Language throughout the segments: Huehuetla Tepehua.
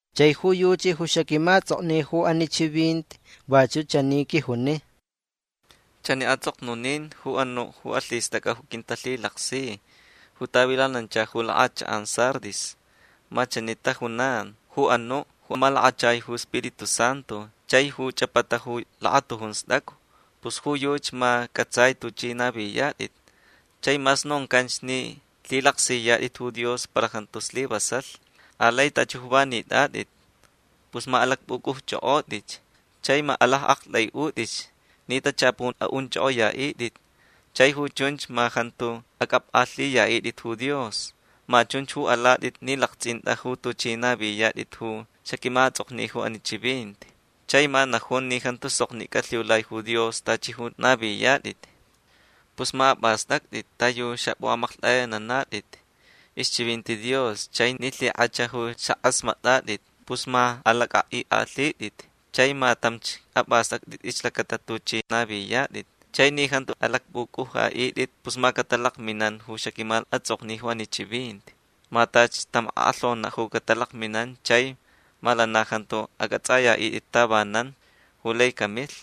Chai ju yuchi ju xaquimaʼatsʼokni ju ani chivinti vachuʼ chani quijuni: “Chani atsʼoknunin ju anuʼ ju alhistʼacʼa ju quintalhilaksi ju tavilanancha ju lakʼachakʼan Sardis. Ma chani tajunan ju anuʼ ju malakachai ju Spiritu Santu chai ju chʼapata ju lakatujun stʼacu. Pus ju yuchi ma cʼatsai tuchʼi naviyatʼit. Chai mas noncanch ni lhilaksiyatʼit ju Dios para jantu slivasalh. Alai tachi ju va nitʼatʼit. Pus ma alacpʼucʼuchʼokʼotʼitch. Chai ma alaʼaktʼaiʼutʼitch ni tachapun aʼunchʼokʼoyaʼitʼit. Chai ju chunch ma jantu acʼapkʼalhiyaʼitʼit ju Dios. Ma chunch ju alatʼit ni laktsʼinta ju tuchʼi naviyatʼit ju xaquimaʼatsʼokni ju ani chivinti. Chai ma najun ni jantu soknicʼa lhiulai ju Dios tachi ju naviyatʼit. Pus ma apʼastʼactʼit ta yu xapʼuʼamaklhtʼayananatʼit ixchivinti Dios chai ni lhikʼach ju xakʼasmatʼatʼit. Pus ma alacʼaʼikʼalhitʼit. Chai ma tamch apʼastʼactʼit ixlacata tuchʼi naviyatʼit. Chai ni jantu alacpʼucʼuʼaʼitʼit pus ma catalakminan ju xaquimaʼatsʼokni ju ani chivinti. Ma tachi tam akʼalhonaʼ ju catalakminan chai ma lana jantu acʼatsʼayaʼitʼit tavanan ju lai camilh.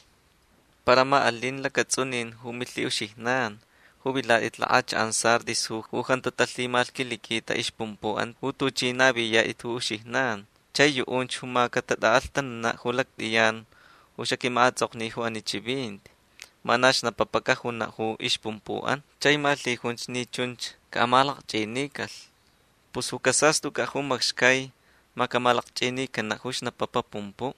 Para ma alin lacatsʼunin ju milhiʼuxijnan ju vilatʼit lakʼachakʼan Sardis ju jantu talhimalhquiliquita ixpumpuʼan ju tuchʼi naviyatʼit ju uxijnan. Chai ju yuʼunch ma catatʼaʼalhtananaʼ lactʼiyan ju xaquimaʼatsʼokni ju ani chivinti. Ma na xnapapa cajunaʼ ju ixpumpuʼan. Chai ma lhijunch ni chunch caʼamalakchʼinincalh. Pus ju casastʼucʼaʼ ju macxcai ma camalakchʼinincanaʼ ju xnapapa pumpuʼ.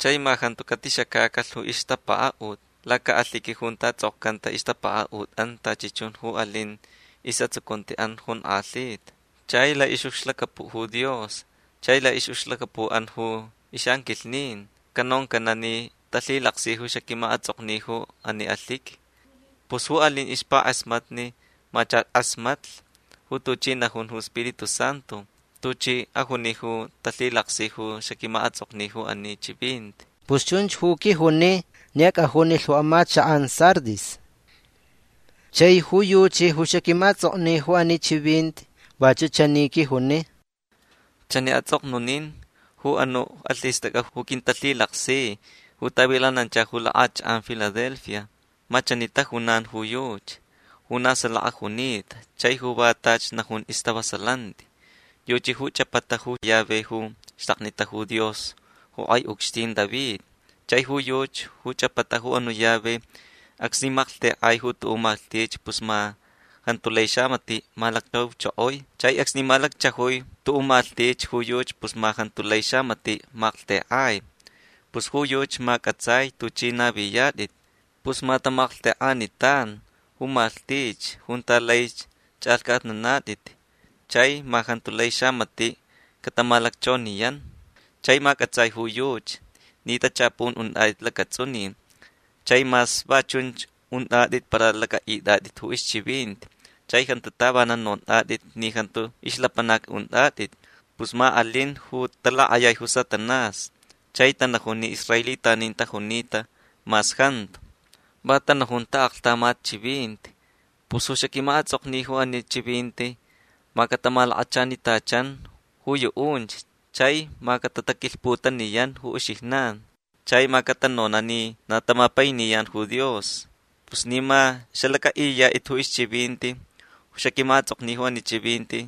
Chai ma jantu catixacacalh ju ixtapakaʼut lacaʼalhiqui junta tsʼokcanta ixtapakaʼutʼan tachi chun ju alin isʼatsucuntiʼan jonkʼalhita. Chai laʼixʼucxlacapuʼ ju Dios chai laʼixʼucxlacapuʼan ju ixʼanquilhnin canoncanaʼ ni talhilaksi ju xaquimaʼatsʼokni ju ani alhiqui. Pus ju alin ju ixpakʼasmatni ma chach kʼasmatlh ju tuchi najun ju Spiritu Santu. Tuchi ajuni ju talhilaksi ju xaquimaʼatsʼokni ju ani chivinti”. Pus chunch ju quijuni ni acʼajunilh ju amachakʼan Sardis. Chai ju yuchi ju xaquimaʼatsʼokni ju ani chivinti vachuʼ chani quijuni: “Chani atsʼoknunin ju anuʼ ju alhistʼacʼa ju quintalhilaksi ju tavilanancha ju lakʼachakʼan Filadelfia. Ma chani tajunan ju yuchi ju na salaka junita chai ju va tachi najun ju istavasalanti. Yuchi ju chʼapata ju llave ju ixtaknita ju Dios ju kʼai ucxtin David. Chai ju yuchi ju chʼapata ju anuʼ llave acsni malhtekʼai tuʼuʼ malhtich pus ma jantu lai xamatiʼ malacchauchokoi. Chai acsni malacchajui tuʼuʼ malhtich ju yuchi pus ma jantu lai xamatiʼ malhtekʼai. Pus ju yuchi ma cʼatsai tuchʼi naviyatʼit. Pus ma tamalhtekʼanitan ju malhtich junta lai chʼalhcʼatnanatʼit chai ma jantu lai xamatiʼ catamalacchoniyan. Chai ma cʼatsai ju yuchi ni tachapun untʼatʼit lacatsʼunin. Chai mas va chunch untʼatʼit para lacʼaʼitʼatʼit ju ixchivinti chai jantu tavanan nontʼatʼit ni jantu ixlapanacni untʼatʼit. Pus ma alin ju talakʼayai ju Satanás chai tanajun ni israelitanin tajunita mas jantu. Va tanajun taʼaklhtamat chivinti. Pus ju xaquimaʼatsʼokni ju ani chivinti ma catamalakachanitachan ju yuʼunch chai ma catataquilhputaniyan ju uxijnan. Chai ma catanonaʼ ni na tamapainiyan ju Dios. Pus ni ma xalacʼaʼiyatʼit ju ixchivinti ju xaquimaʼatsʼokni ju ani chivinti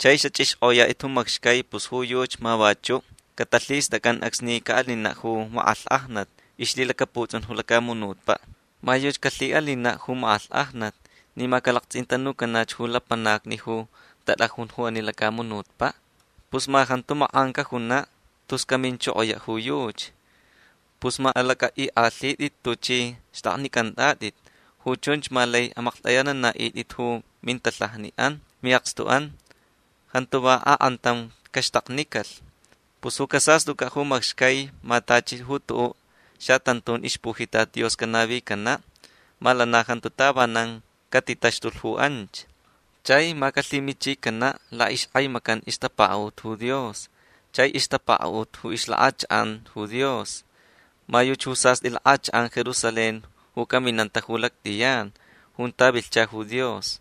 chai xachʼixkʼoyatʼit ju macxcai pus ju yuchi ma vachuʼ catalhistʼacʼan acsni caʼalinaʼ ju makʼalhkʼajnat ixlhilacaputsʼun ju lacamunutpaʼ. Ma yuchi calhiʼalinaʼ ju makʼalhkʼajnat ni ma calaktsʼintanucanach ju lapanacni ju tatʼajun ju ani lacamunutpaʼ. Pus ma jantu makʼan cajunaʼ tus caminchokoyaʼ ju yuchi. Pus ma alacʼaʼikʼalhitʼit tuchʼi xtʼaknicʼantʼatʼit. Ju chunch ma lai amakʼalhtʼayananaʼitʼit ju mintalhajaʼan miʼakstuʼan. Jantu va akʼantam caxtaknicalh. Pus ju casastʼucʼaʼ ju macxcai ma tachi ju tuʼuʼ xatantun ixpujitat Dios canavicanaʼ. Ma lana jantu tavanan catitaxtulh ju anch. Chai ma calhimichicanaʼ laʼixkʼaimacan ixtapakaʼut ju Dios chai ixtapakaʼut ju ixlakʼachakʼan ju Dios. Ma yuchi ju sastʼi lakʼachakʼan Jerusalén ju caminanta ju lactʼiyan junta vilhcha ju Dios.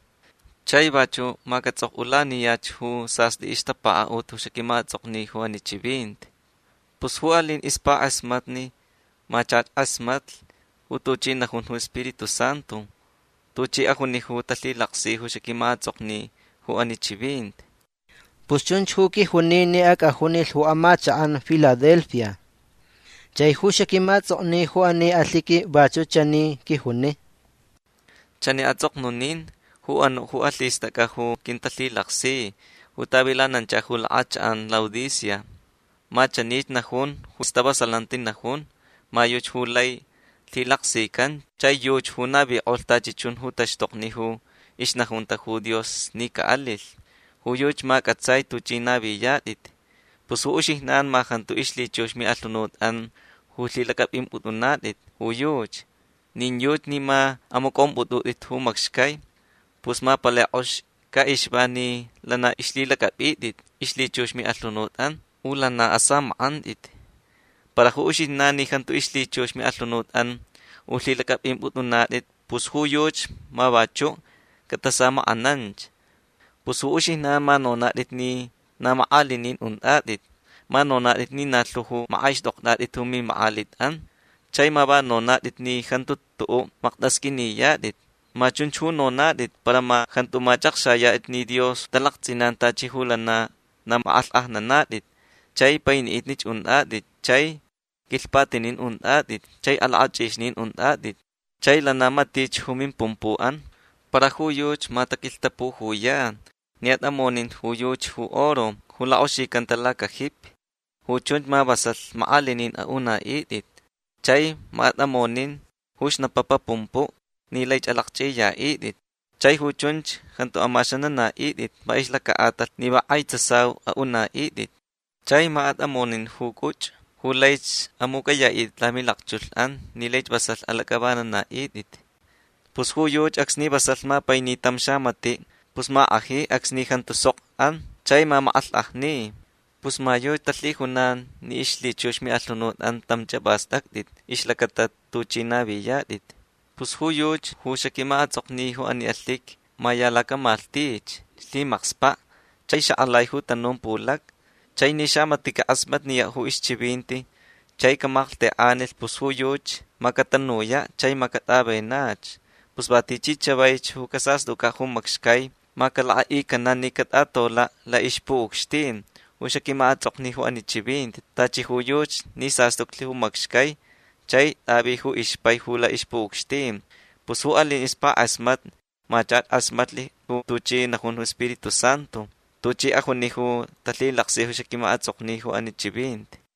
Chai vachuʼ ma catsʼokʼulaniyach ju sastʼi ixtapakaʼut ju xaquimaʼatsʼokni ju ani chivinti. Pus ju alin ixpakʼasmatni ma chach kʼasmatlh ju tuchi najun ju Spiritu Santu. Tuchi ajuni ju talhilaksi ju xaquimaʼatsʼokni ju ani chivinti”. Pus chunch ju quijuni ni acʼajunilh ju amachakʼan Filadelfia. Chai ju xaquimaʼatsʼokni ju ani alhiqui vachuʼ chani quijuni: “Chani atsʼoknunin ju anuʼ ju alhistʼacʼa ju quintalhilaksi ju tavilanancha ju lakʼachakʼan Laodicea. Ma chanich najun ju stavasalanti najun. Ma yuchi ju lai lhilaksican chai yuchi ju navikʼolh tachi chun ju taxtokni ju ixnajunta ju Dios ni caʼalilh. Ju yuchi ma cʼatsai tuchʼi naviyatʼit. Pus ju uxijnan ma jantu ixlhichux ju miʼalhunutʼan ju lhilacʼapʼimpʼutʼunatʼit ju yuchi. Nin yuchi ni ma amacʼompʼutʼutʼit ju macxcai. Pus ma palai kʼox caʼixva ni lana ixlhilacʼapʼitʼit ixlhichux miʼalhunutʼan. U lana asamakʼantʼit. Para ju uxijnan ni jantu ixlhichux miʼalhunutʼan ju lhilacʼapʼimpʼutʼunatʼit pus ju yuchi ma vachuʼ catasamakʼananch. Pus ju uxijnan ma nonatʼit ni na makʼalinin untʼatʼit. Ma nonatʼit ni na lhu ju makʼaixtʼoktʼatʼit ju mimakʼalitʼan. Chai ma va nonatʼit ni jantu tuʼuʼ maktasqʼuiniyatʼit. Ma chunch ju nonatʼit para ma jantu machʼakxayatʼit ni Dios talaktsʼinan tachi ju lana na makʼalhkʼajnanatʼit chai painiʼitnich untʼatʼit chai quilhpatinin untʼatʼit chai alakʼachʼixnin untʼatʼit chai lana matich ju mimpumpuʼan. Para ju yuchi ma taquilhtapujuyan ni atʼamonin ju yuchi ju oro ju lakʼoxicanta lacajipi. Ju chunch ma vasalh makʼalinin aʼunaʼitʼit. Chai ma atʼamonin ju xnapapa pumpuʼ ni laich alakchʼiyaʼitʼit. Chai ju chunch jantu amaxananaʼitʼit va ixlacaʼatalh ni va kʼai tsasau aʼunaʼitʼit. Chai ma atʼamonin ju cʼuchʼu ju laich amucʼayaʼitʼit lamilakchulhʼan ni laich vasalh alacʼavananaʼitʼit. Pus ju yuchi acsni vasalh mapaini tam xamatiʼ pus ma kʼaji acsni jantu sok an chai mamakʼalhkʼajni. Pus ma yuchi talhijunan ni ixlhichux ju miʼalhunutʼan tamch apʼastʼactʼit ixlacata tuchʼi naviyatʼit. Pus ju yuchi ju xaquimaʼatsʼokni ju ani alhiqui ma ya lacamalhtich lhimakspaʼ chai xakʼalai ju tanun pulacni. Chai ni xamatiʼ cakʼasmatniyaʼ ju ixchivinti chai camalhtekʼanilh pus ju yuchi ma catanuyaʼ chai ma catʼavenach. Pus va tichi chavaich ju casastʼucʼaʼ ju macxcai ma calakʼaʼicanaʼ ni catʼatolaʼ laʼixpuʼucxtin ju xaquimaʼatsʼokni ju ani chivinti tachi ju yuchi ni sastuclh ju macxcai chai tʼavi ju ixpai ju laʼixpuʼucxtin. Pus ju alin ju ixpakʼasmatni ma chach kʼasmatlh ju tuchi najun ju Spiritu Santu. Tuchi ajuni ju talhilaksi ju xaquimaʼatsʼokni ju ani chivinti”.